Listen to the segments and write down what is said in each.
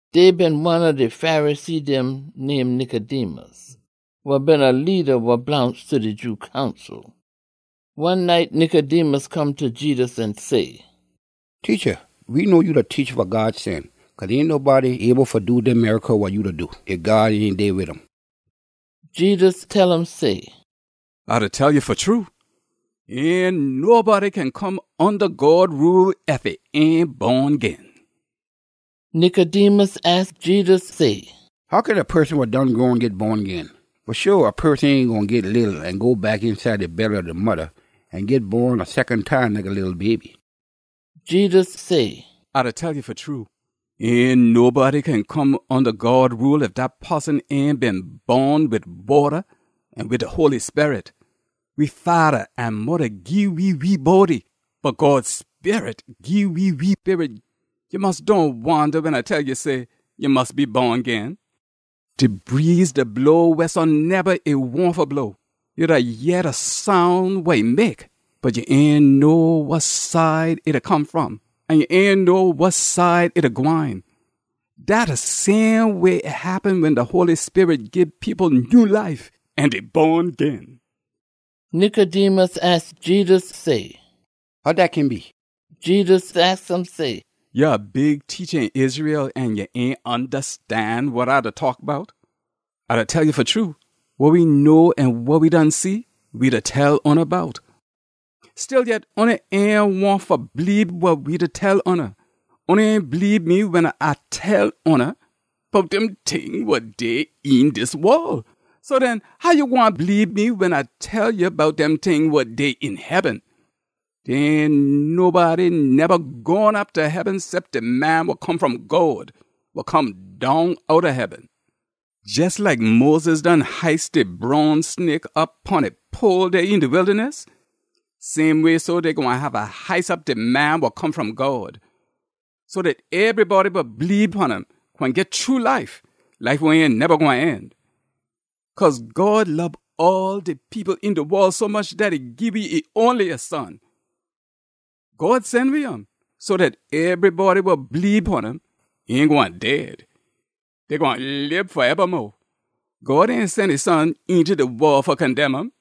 Dey been one ob de Pharisee dem name Nicodemus, wa been a leada wa blongst ta de Jew Council. One night, Nicodemus come ta Jedus an say, “Teacha, we know ya a teacha wa God sen. Cause ain nobody able fa do dem miracle wa ya da do, ef God ain dey wid um.” Jedus tell um say, “A da tell ya fa true, ain nobody kin come onda God rule ef e ain bon gin.” Nicodemus aks Jedus say, “How kin a poson wa done grown git bon gin? Fa sho, a poson ain gwine git leetle an go back eenside de belly ob e modda an git bon a secon time like a leetle baby!” Jedus say, “A da tell ya fa true, ain nobody kin come onda God rule ef dat poson ain bon wid wata an wid de Holy Sperit. We fada an modda gii we we body, bot God Sperit gii we we sperit. Ya mus dohn wonda wen A tell ya say, ‘Ya mus be bon gin.’ De breeze da blow wehsoneba e wahn fa blow. Ya da yeh de soun wa e mek, bot ya ain know wa side e da come fom an ya ain know wa side e da gwine. Dat de same way e happen wen de Holy Sperit gii people nyew life, an dey bon gin.” Nicodemus aks Jedus say, “How dat kin be?” Jedus aks um say, “Ya a big teacha een Israel an ya ain ondastan wa A da taak bout? A da tell ya fa true, wa we know an wa we done see, we da tell oona bout. Stillyet, oona ain wahn fa bleebe wa we da tell oona. Oona ain bleebe me wen A tell oona bout dem ting wa dey een dis wol. So den, how ya gwine bleebe me wen A tell ya bout dem ting wa dey een heaben? Dey ain nobody neba gone op ta heaben cep de Man wa Come fom God, wa come down outta heaben. “Jes like Moses done hice de bronze snake op pon a pole dey een de wildaness, same way so, dey gwine haffa hice op de Man wa Come fom God, so dat ebrybody wa bleebe pon um gwine git true life wa ain gwine neba end. Cause God lob all de people een de wol sommuch dat e gii we e onliest Son. God sen we um so dat ebrybody wa bleebe pon um ain gwine dead. Dey gwine lib faebamo. God ain sen e Son eenta de wol fa condemn um.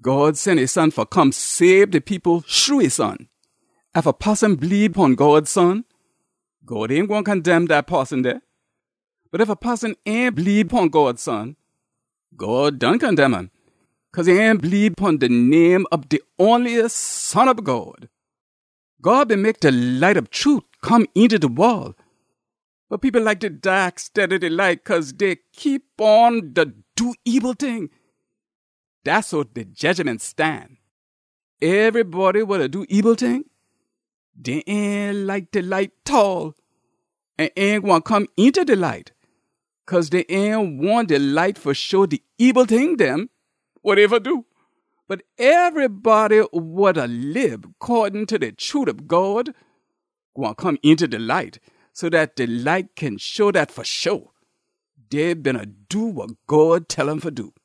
God sen e Son fa come sabe de people shru e Son. “Ef a poson bleebe pon God Son, God ain gwine condemn dat poson dey. Bot ef a poson ain bleebe pon God Son, God done condemn um, cause e ain bleebe pon de name ob de onliest Son ob God. God been mek de light ob trute come eenta de wol, bot people like de daak steada de light cause dey keep on da do ebil ting. Dat so de jedgiment stan. Ebrybody wa da do ebil ting, dey ain like de light tall an ain gwine come eenta de light, cause dey ain wahn de light fa show de ebil ting dem wa dey da do. Bot ebrybody wa da lib coddin ta de trute ob God gwine come eenta de light, so dat de light kin show dat fa sho dey beena do wa God tell um fa do.”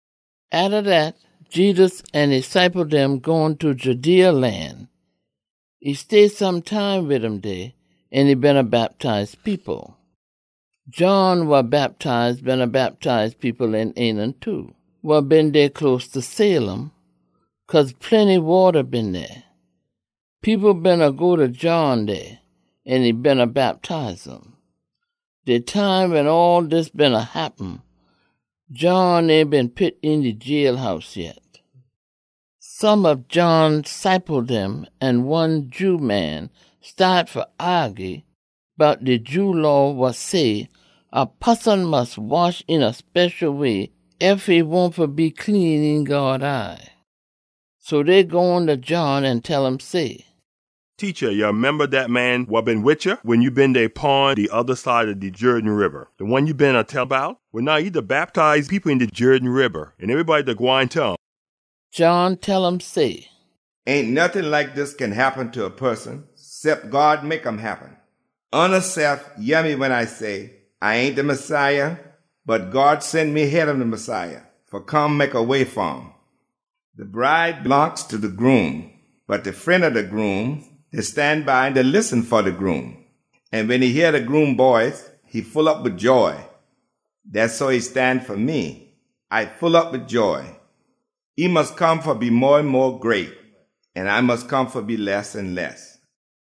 Atta dat, Jedus an e ciple dem gone ta Judea lan. E stay some time wid um dey an e beena bactize people. John wa Bactize beena bactize people een Aenon too, wa been dey close ta Salim, cause plenty wata been dey. People beena go ta John dey, an e beena bactize um. (De time wen all dis beena happen, John ain been pit een de jailhouse yet.) Some ob John ciple dem an one Jew man staat fa aagy bout de Jew Law wa say a poson mus wash een a special way ef e wahn fa be clean een God eye. So dey gone ta John an tell um say, “Teacha, ya memba dat man wa been wid ya wen ya been dey pon de oda side ob de Jerden Riba, de one ya beena tell bout? Well, now e da bactize people een de Jerden Riba, an ebrybody da gwine ta um!” John tell um say, “Ain nottin like dis kin happen ta a poson cep God mek um happen. Oonasef yeh me wen A say, ‘A ain de Messiah, bot God sen me heada de Messiah, fa come mek a way fa um.’ De bride blongst ta de groom, bot de fren ob de groom da stan by da listen fa de groom, an wen e yeh de groom boice e full op wid joy. Dat so e stan fa me. A full op wid joy. E mus come fa be mo an mo great, an A mus come fa be less an less.”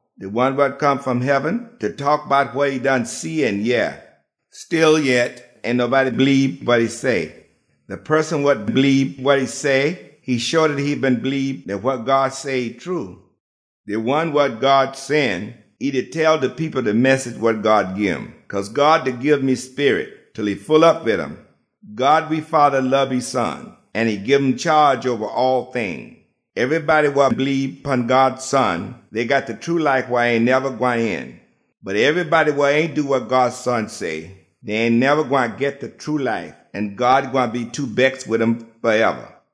De one wa come fom heaben da taak bout wa e done see an yeh. Stillyet, ain nobody bleebe wa e say. De poson wa bleebe wa e say, e show dat e been bleebe dat wa God say, e true. De one wa God sen, e da tell people de message wa God gim, cause God da gim e Sperit, til e full op wid um. God we Fada da lob e Son an e gim chaage oba all ting. Ebrybody wa bleebe pon God Son, dey got de true life wa ain neba gwine end. Bot ebrybody wa ain do wa God Son say, dey ain neba gwine git de true life, an God gwine be too bex wid um faeba.